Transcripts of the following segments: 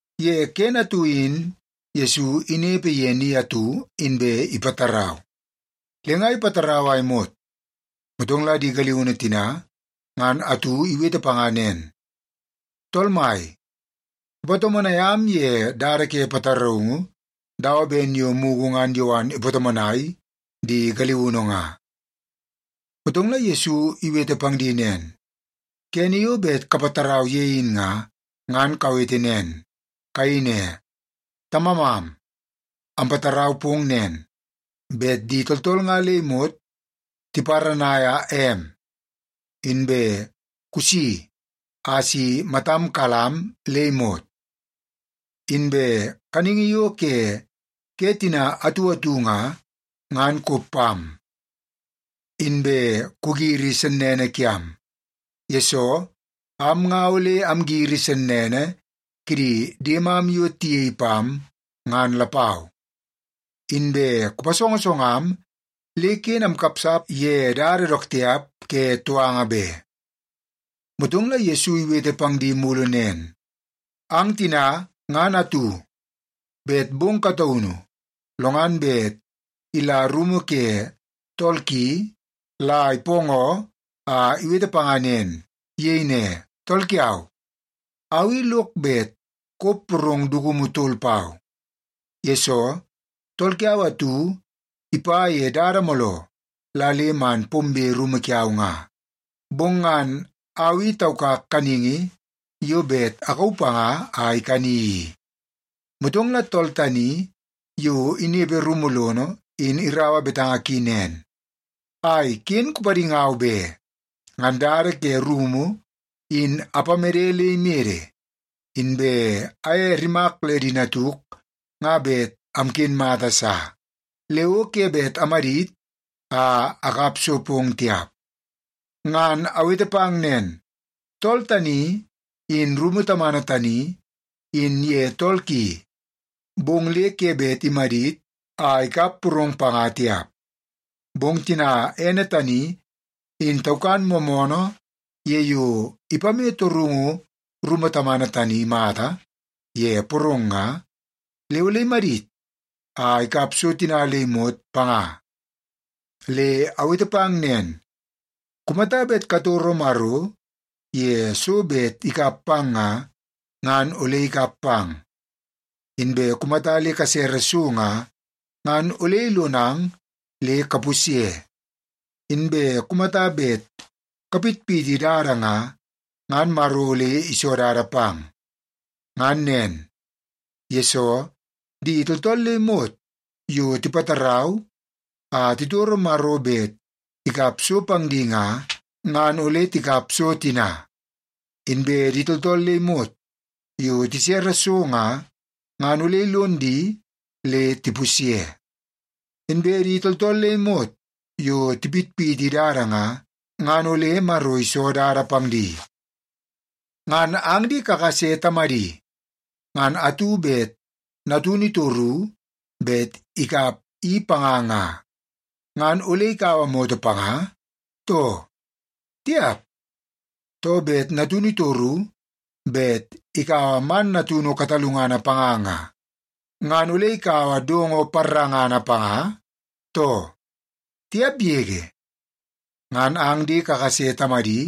Ye kene atu in Yesu inepe ye ni atu, inbe ipatarau. Le nga ipatarau a imot, motong la di galiunu tina ngan atu iwete panga nen, “Tool Mai, kupatomonai am ye dada ke pataraungu dawa ben yo mugu ngan Yowan ipatomonai di galiunu nga.” Motong la Yesu iwete pang di nen, “Kene yo bet kapatarau ye in nga, ngan kawete nen. Kayei ne, ‘Tamamam, ampatarau pong nen, bet di tooltool nga le imot tiparanaia em, inbe kusi a si matam kalam am le imot. Inbe kaningi yo ke ke tina atu atu nga, ngan kop pam. Inbe kugiri sennene kiam, yesoo am nga ole amgiri sennene kidi diemam yo tiyei pam, ngan lapau. Inbe kupasongosongam le ken amkapsap ye dada dook tiap ke touanga be.’” Motong la Yesu iwete pang di mulu nen, “Ang tina ngan atu, bet bong kataunu lo ngan bet ila rumu ke tool ki la ipoongoo a iwete panga nen. Iyei ne, ‘Tool kiau, au i lok bet kop porong dukumu tol pau. Yesoo, tool kiau atu ipa ye dada mooloo la le man pombe rumu kiau nga. Bong ngan au i taukak kaningi yo bet akauu panga a ikani i.’ Motong la tool tani yo inepe rumu lono in iraua betanga ki nen, ‘Ai, ken kupadingau be. Ngan dada ke rumu in apamede le imede, inbe aye rimak le di natuk nga bet amken mata sa. Le o ke bet amadit a akap so pong tiap.’ Ngan awete pang nen, tool tani, in rumu tamana tani, in ye tool ki, bong le ke bet imadit a ikap porong panga tiap. Bong tina ene tani in taukan moomoonoo ye yo ipame torungu rumu tamana tani mata ye porong nga, le ole imadit a ikap so tina le imot panga. Le awete pang nen, kumata bet katoro Maro ye so bet ikap pang nga, ngan ole ikap pang. Inbe kumata le kasere so nga, ngan ole ilonang le kapusye. Inbe kumata bet kapitpiti dada nga, ngan Maro ole iso dada pang. Ngan nen, yesoo di tooltool le imot yo tipatarau a titoro Maro bet ikap so pang di nga, ngan ole tikap so tina. Inbe di tooltool le imot yo tisere so nga, ngan ole ilon di le tipusye. Inbe di tooltool le imot yo tipitpiti dada nga, ngan ole Maro iso dada pang di. Ngan ang di kakase tamadi ngan atu bet natunu itoru bet ikap i panga nga, ngan ole ikaua moto panga, too? Tiap! Too, bet natunu itoru bet ikaua man natunu katalungana panga nga, ngan ole ikaua dongo parangana panga, too? Tiap yege! Ngan ang di kakase tamadi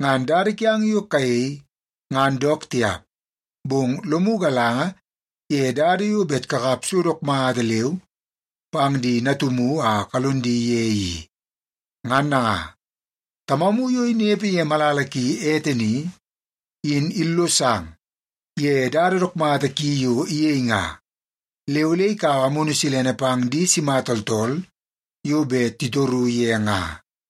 ngan dada kiang yo kayei ngan dook tiap, bong lomu galanga ye dada yo bet kakap so dook mata leu pang di natumu a kalon di ye i. Ngan nanga, Tamamu yo inepe ye malala ki ete ni, in illosang ye dada dook mata ki yo iyei nga, le ole ikaua Amunu Silene pang di sima tooltool yo bet titoru ye nga.”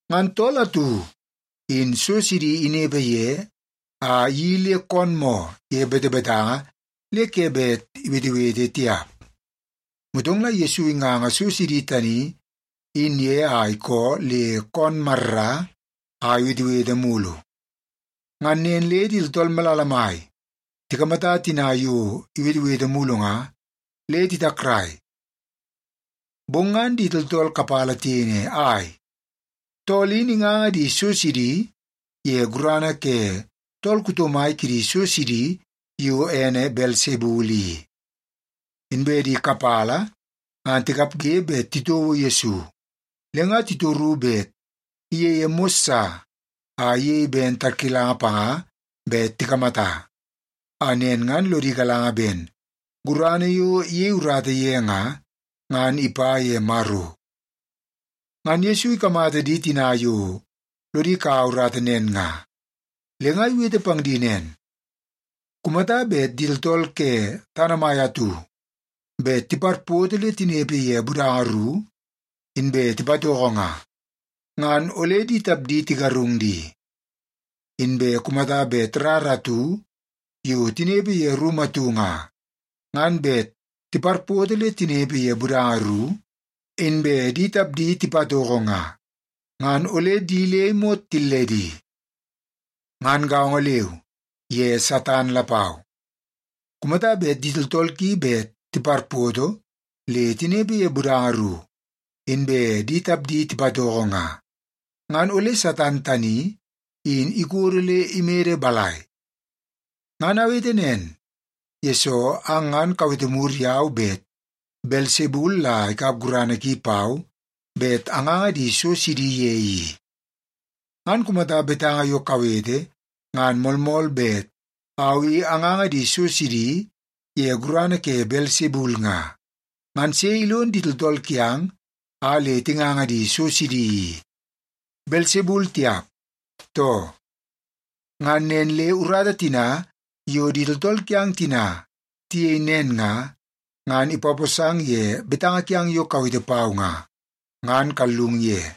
Ngan tool atu in so sidi inepe ye a iyeii le koon moo ye betebetanga le ke bet iwetewete tiap. Motong la Yesu inganga so sidi tani in ye a ikoo le koon marra a iwetewete mulu. Ngan nen le di tooltool malala mai tikamata tina yo iwetewete mulu nga, le titakrai. Bong ngan di tooltool kapala tiyei ne, “Ai, tool in inganga di so sidi ye gurana ke tool kuto mai kidi so sidi yo ene Belsebul i.” Inbe di kapala ngan tikapge bet titouo Yesu, le nga titoru bet iyeie mos sa a iyei ben tarkilanga panga bet tikamata, a nen ngan lodi galanga ben gurana yo iyei urata ye nga, ngan ipa ye Maro. Ngan Yesu ikamata di tina yo lodi kaua urata nen nga, le nga iwete pang di nen, “Kumata bet di tooltool ke tana mai atu bet tiparpoto le tinepe ye budanga ru, inbe tipatoko nga, ngan ole di tapdi tigarung di. Inbe kumata bet rara atu yo tinepe ye rumu atu nga, ngan bet tiparpoto le tinepe ye budanga ru, inbe di tapdi tipatoko nga, ngan ole di le imot tilledi. Ngan gaongo leu ye Satan lapau. Kumata bet di tooltool ki bet tiparpoto le tinepe ye budanga ru, inbe di tapdi tipatoko nga, ngan ole Satan tani in ikodo le imede balai? Ngan awete nen, yesoo ang ngan kawete mur yau bet Belsebul la ikap gurana ki pau bet anganga di so sidi ye i. Ngan kumata betanga yo kawete ngan moolmool bet au i anganga di so sidi ye gurana ke Belsebul nga, ngan sei ilon di tooltool kiang a le tinganga di so sidi i? Belsebul tiap, too? Ngan nen le urata tina yo di tooltool kiang tina tiyei nen nga, ngan ipaposang ye betanga kiang yo kawete pau nga, ngan kallung ye.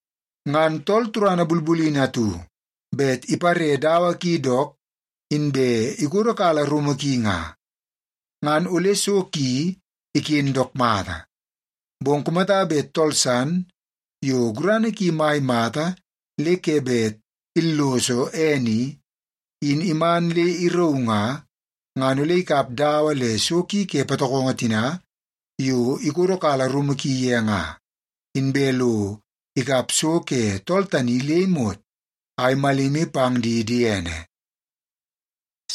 “Ngan tool turana bulbulini atu bet ipare dawa ki dook inbe ikodokala rumu ki nga, ngan ole so ki iken dook mata. Bong kumata bet tool san yo gurana ki mai mata le ke bet illoso ene i, in iman le irauu nga, ngan ole ikap dawa le so ki ke patokongo tina yo ikodokala rumu ki ye nga, inbe lo ikap so ke tool tani le imot a imalimi pang di diene.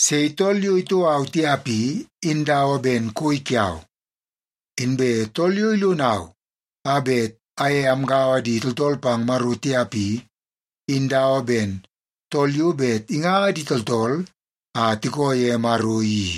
“Sei tool yo itoo au tiap i, in dawa ben koi kiau. Inbe tool yo ilonau a bet aye amgaua di tooltool pang Maro tiap i, in dawa ben tool yo bet inganga di tooltool a tikoo ye Maro i.”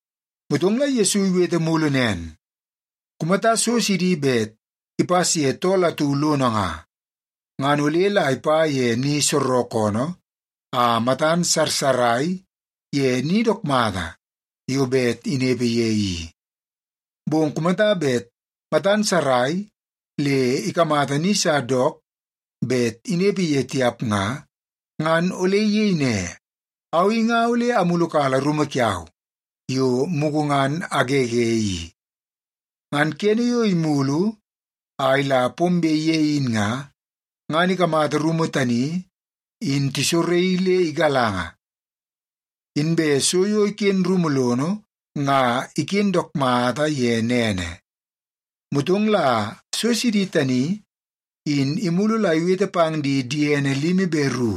Motong la Yesu iwete mulu nen, “Kumata so sidi bet ipas ye tool atu lono nga, ngan ole la ipa ye ni soorookoonoo a matan sarsarai ye ni dook mata yo bet inepe ye i. Bong kumata bet matan sarai le ikamata ni sa dook bet inepe ye tiap nga, ngan ole iyei ne, ‘Au i nga ole amulukala rumu kiau yo mugu ngan agege i.’ Ngan kene yo imulu a ila pombe ye in nga, ngan ikamata rumu tani in tisoraii le igalanga, inbe so yo iken rumu lono nga iken dook mata ye nene. Motong la so sidi tani in imulu la iwete pang di diene limi be ru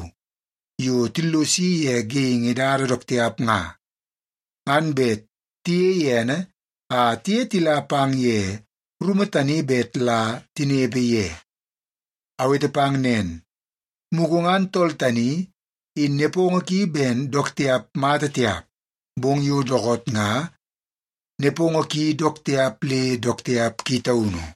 yo tillosi ye geingi dada dook tiap nga, ngan bet tiyei ene a tiye tila pang ye rumu tani bet la tinepe ye. Awete pang nen, mugu ngan tool tani in nepongo ki ben dook tiap mata tiap, bong yo dookoot nga nepongo ki dook tiap le dook tiap ki taunu.”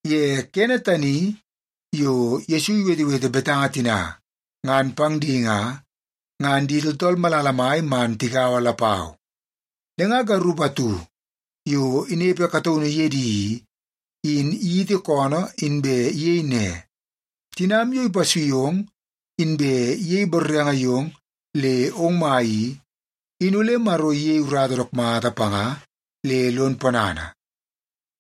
Ye kene tani yo Yesu iwetewete betanga tina ngan pang di nga, ngan di tooltool malala mai man tigaua lapau, le nga garup atu yo inepe kataunu ye di i, in iyiti koonoo inbe iyei ne, “Tinam yo ipasui ong inbe iyei borrenge yong le ong mai i, in ole Maro iyei urata dook mata panga le lon ponana.”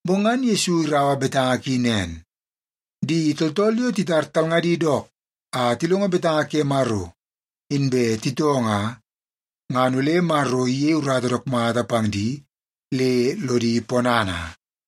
Bong ngan Yesu iraua betanga ki nen, “Di tooltool yo titar talngadi dook a tilongo betanga ke Maro inbe titoo nga, ngan ole Maro iyei urata dook mata pang di le lodi ponana.”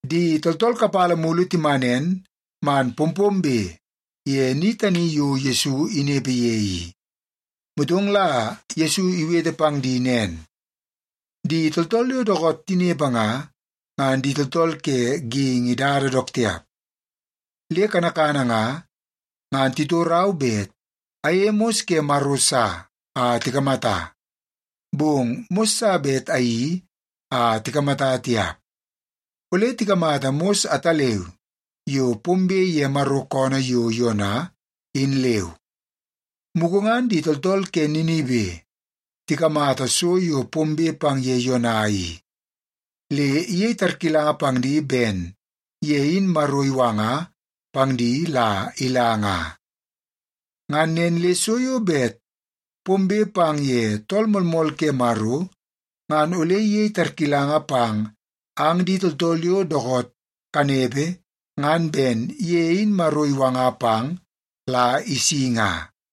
Di tooltool kapala mulu timanen man pompombe ye ni tani yo Yesu inepe ye i. Motong la Yesu iwete pang di nen, “Di tooltool yo dookoot tinepe nga, ngan di tooltool ke geingi dada dook tiap. Le kanakana nga, ngan titorau bet ayeie mos ke Maro sa a tikamata. Bong mos sa bet ayeii a tikamata tiap. Ole tikamata mos ataleu yo pombe ye Maro koonoo yo Yona, in leu. Mugu ngan di tooltool ke Ninibe tikamata so yo pombe pang ye Yona i, le iyei tarkilanga pang di ben ye in Maro iwanga pang di la ila nga. Ngan nen le so yo bet pombe pang ye Tool Moolmool ke Maro ngan ole iyei tarkilanga pang ang di tooltool yo dookoot kanepe ngan ben ye in Maro iwanga pang la isi nga.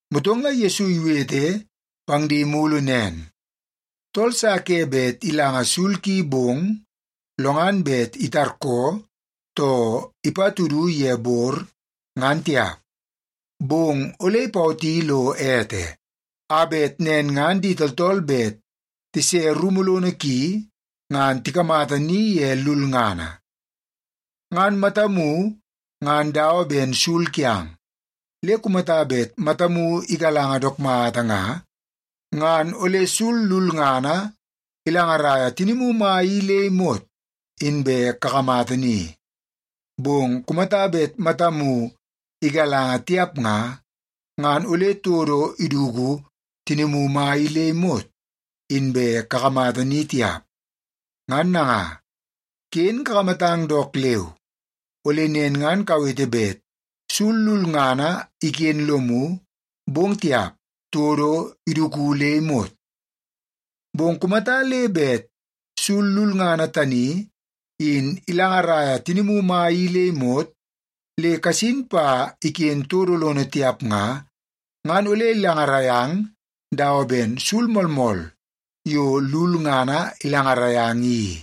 Motong la Yesu iwete pang di mulu nen, “Tool sa ke bet ilanga sul ki bong, lo ngan bet itarkoo, too ipatudu ye bor, ngan tiap. Bong ole ipawoti lo ete, a bet nen ngan di tooltool bet tise rumu lono ki ngan tikamata ni ye lulngana. Ngan matamu ngan dawa ben sul kiang. Le kumata bet matamu igalanga dook mata nga, ngan ole sul lulngana ilangaraia tinimu mai i le imot inbe kakamata ni. Bong kumata bet matamu igalanga tiap nga, ngan ole todo iduku tinimu mai i le imot inbe kakamata ni tiap. Ngan nanga, ken kakamatang dook leu, ole nen ngan kawete bet sul lulngana iken lomu, bong tiap, todo iduku le imot. Bong kumata le bet sul lulngana tani in ilangaraia tinimu mai i le imot, le kasin pa iken todo lono tiap nga, ngan ole ilangarai ang dawa ben sul moolmool yo lulngana ilangarai ang i.”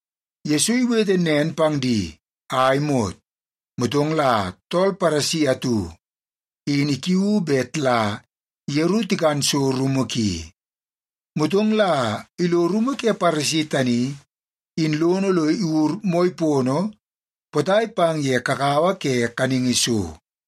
Yesu iwete nen pang di a imot, motong la tool Paresi atu in ikiuu bet la yeru tikan so rumu ki. Motong la ilo rumu ke Paresi tani in lono lo iwur moi pono potai pang ye kakawa ke kaningi so.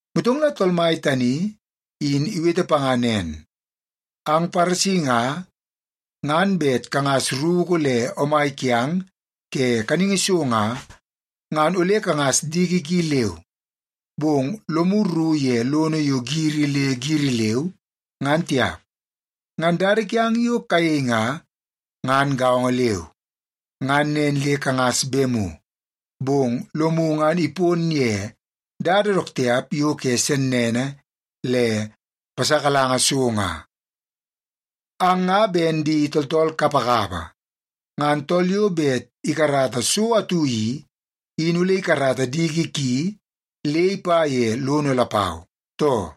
Motong la Tool Mai tani in iwete panga nen, “Ang Paresi nga, ngan bet kangas ruku le omai kiang ke kaningi so nga, ngan ole kangas diki ki leu. Bong lomu rru ye lono yo giri le giri leu, ngan tiap. Ngan dada kiang yo kayei nga, ngan gaongo leu. Ngan nen le kangas bemu, bong lomu nga ipon ye dada dook tiap yo ke sennene le pasakalanga so nga. Ang nga ben di tooltool kapakapa! Ngan tool yo bet ikarata so atu i, in ole ikarata diki ki le ipa ye lono lapau, too?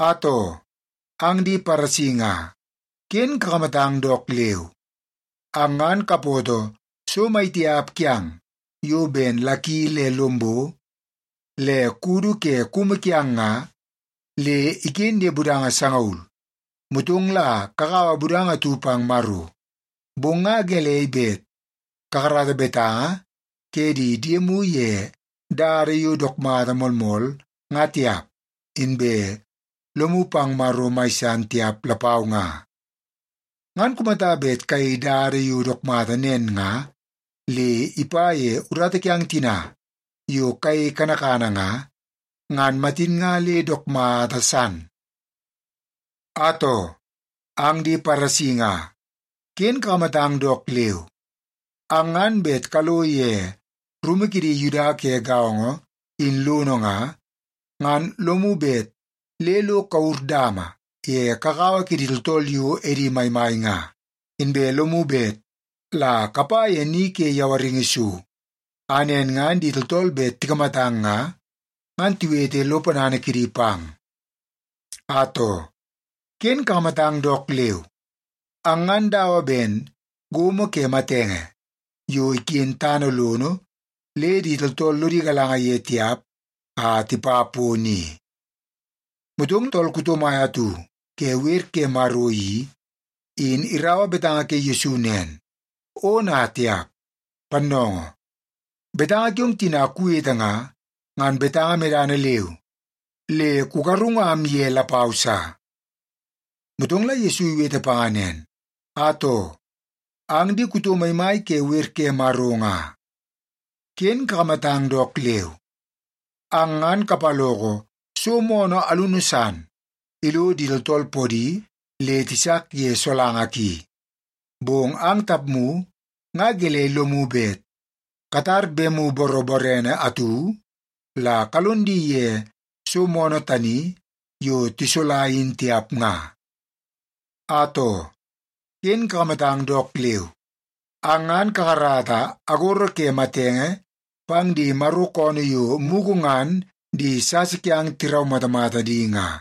“Atoo, ang di Paresi nga, ken kakamatang dook leu! Ang ngan kapoto so maitiap kiang yo ben laki le lombo le kudu ke kumu kiang nga, le iken ye budanga sangaul, motong la kakaua budanga atu pang Maro. Bong nga gelei bet kakarata betanga ke di diemu ye dada yo dook mata moolmool nga tiap, inbe lomu pang Maro mai san tiap lapau nga? Ngan kumata bet kayei dada yo dook mata nen nga, le ipa ye urata kiang tina yo kayei kanakana nga, ngan matin nga le dook mata san. “Atoo, ang di Paresi nga, ken kakamatang dook leu! Ang ngan bet kalo ye rumu kidi Yuda ke gaongo in lono nga, ngan lomu bet le lo kawur dama ye kakawa kidi tooltool yo edi maimai nga. Inbe lomu bet la kapa ye ni ke yawaringi so, a nen ngan di tooltool bet tikamatang nga, ngan tiwete lo ponana kidi pang. “Atoo, ken kakamatang dook leu! Ang ngan dawa ben gomo ke matenge yo iken tana lono le di tooltool lodi galanga ye tiap a tipa pono i.” Motong tool kuto mai atu ke wer ke Maro i, in iraua betanga ke Yesu nen, “Ona tiap! Pannoongoo, betanga kiong tina kuwete nga, ngan betanga medana leu le kugarungam ye lapau sa.” Motong la Yesu iwete panga nen, “Atoo, ang di kuto maimai ke wer ke Maro nga, ken kakamatang dook leu! Ang ngan kapaloko so moonoo alunu san ilo di tooltool podi le tisak ye solanga ki. Bong ang tapmu nga gelei lomu bet katara bemu boroborene atu la kalon di ye so moonoo tani yo tisola in tiap nga? “Atoo, ken kakamatang dook leu! Ang ngan kakarata agoro ke matenge pang di Maro koonoo yo mugu ngan di sasa kiang tiraumatamata di nga.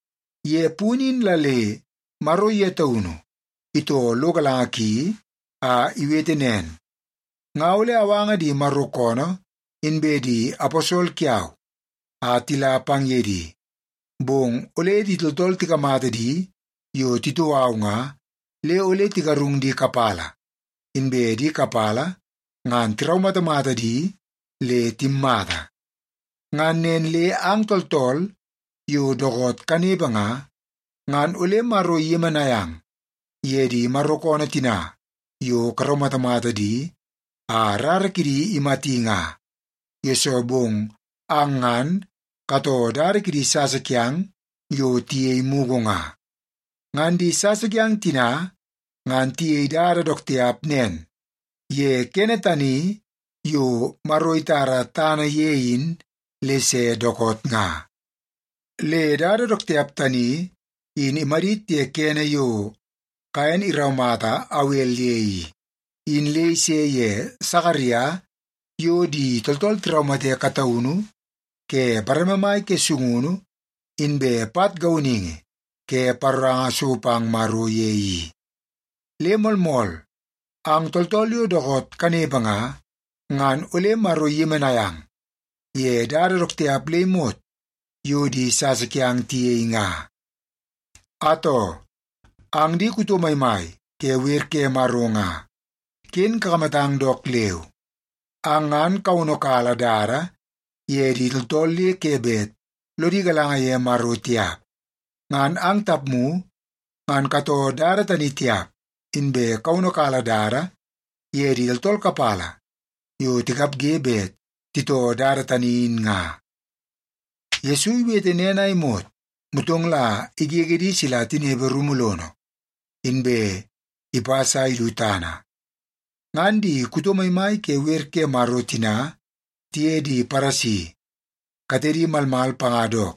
Ye punu in la le Maro ye taunu itoo lo galanga ki a iwete nen, ‘Nga ole awanga di Maro koonoo inbe di aposol kiau a tila pang ye di, bong ole di tooltool tikamata di yo titoo au nga, le ole tigarung di kapala, inbe di kapala ngan tiraumatamata di le timmata.’ Ngan nen le ang tooltool yo dookoot kanepe nga, ngan ole Maro iyemenai ang ye di Maro koonoo tina yo karaumatamata di a rara kidi imati nga, yesoo bong ang ngan katoo dada kidi sasa kiang yo tiyei mugu nga. Ngan di sasa kiang tina ngan tiyei dada dook tiap nen ye kene tani yo Maro itara tana ye in le se dookoot nga. Le dada dook tiap tani in imadit ye kene yo Kaen iraumata Awel ye i, in le ise ye Sakaria yo di tooltool tiraumate kataunu ke bareme mai ke sungunu inbe pat gauningi ke paroranga so pang Maro ye i. Le moolmool, ang tooltool yo dookoot kanepe nga, ngan ole Maro iyemenai ang ye dada dook tiap le imot yo di sasa kiang tiyei nga. “Atoo, ang di kuto maimai ke wer ke Maro nga, ken kakamatang dook leu! Ang ngan kawono kala dada ye di tooltool le ke bet lodi galanga ye Maro tiap. Ngan ang tapmu ngan katoo dada tani tiap, inbe kawono kala dada ye di tooltool kapala yo tikapge bet titoo dada tani in nga.” Yesu iwete nen a imot, motong la igege di sila tinepe rumu lono, inbe ipas a idu tana. Ngan di kuto maimai ke wer ke Maro tina tiye di Paresi katedi malmal panga dook,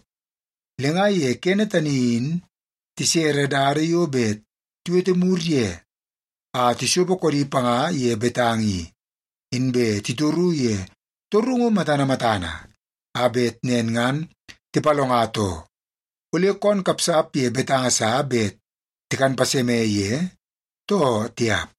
le nga ye kene tani in tisere dada yo bet tiwete mur ye a tisopo koodi panga ye betanga i, inbe titoru ye torungu matana matana, a bet nen ngan tipalonga too, ole koon kapsap ye betanga sa bet tikan paseme ye, too tiap.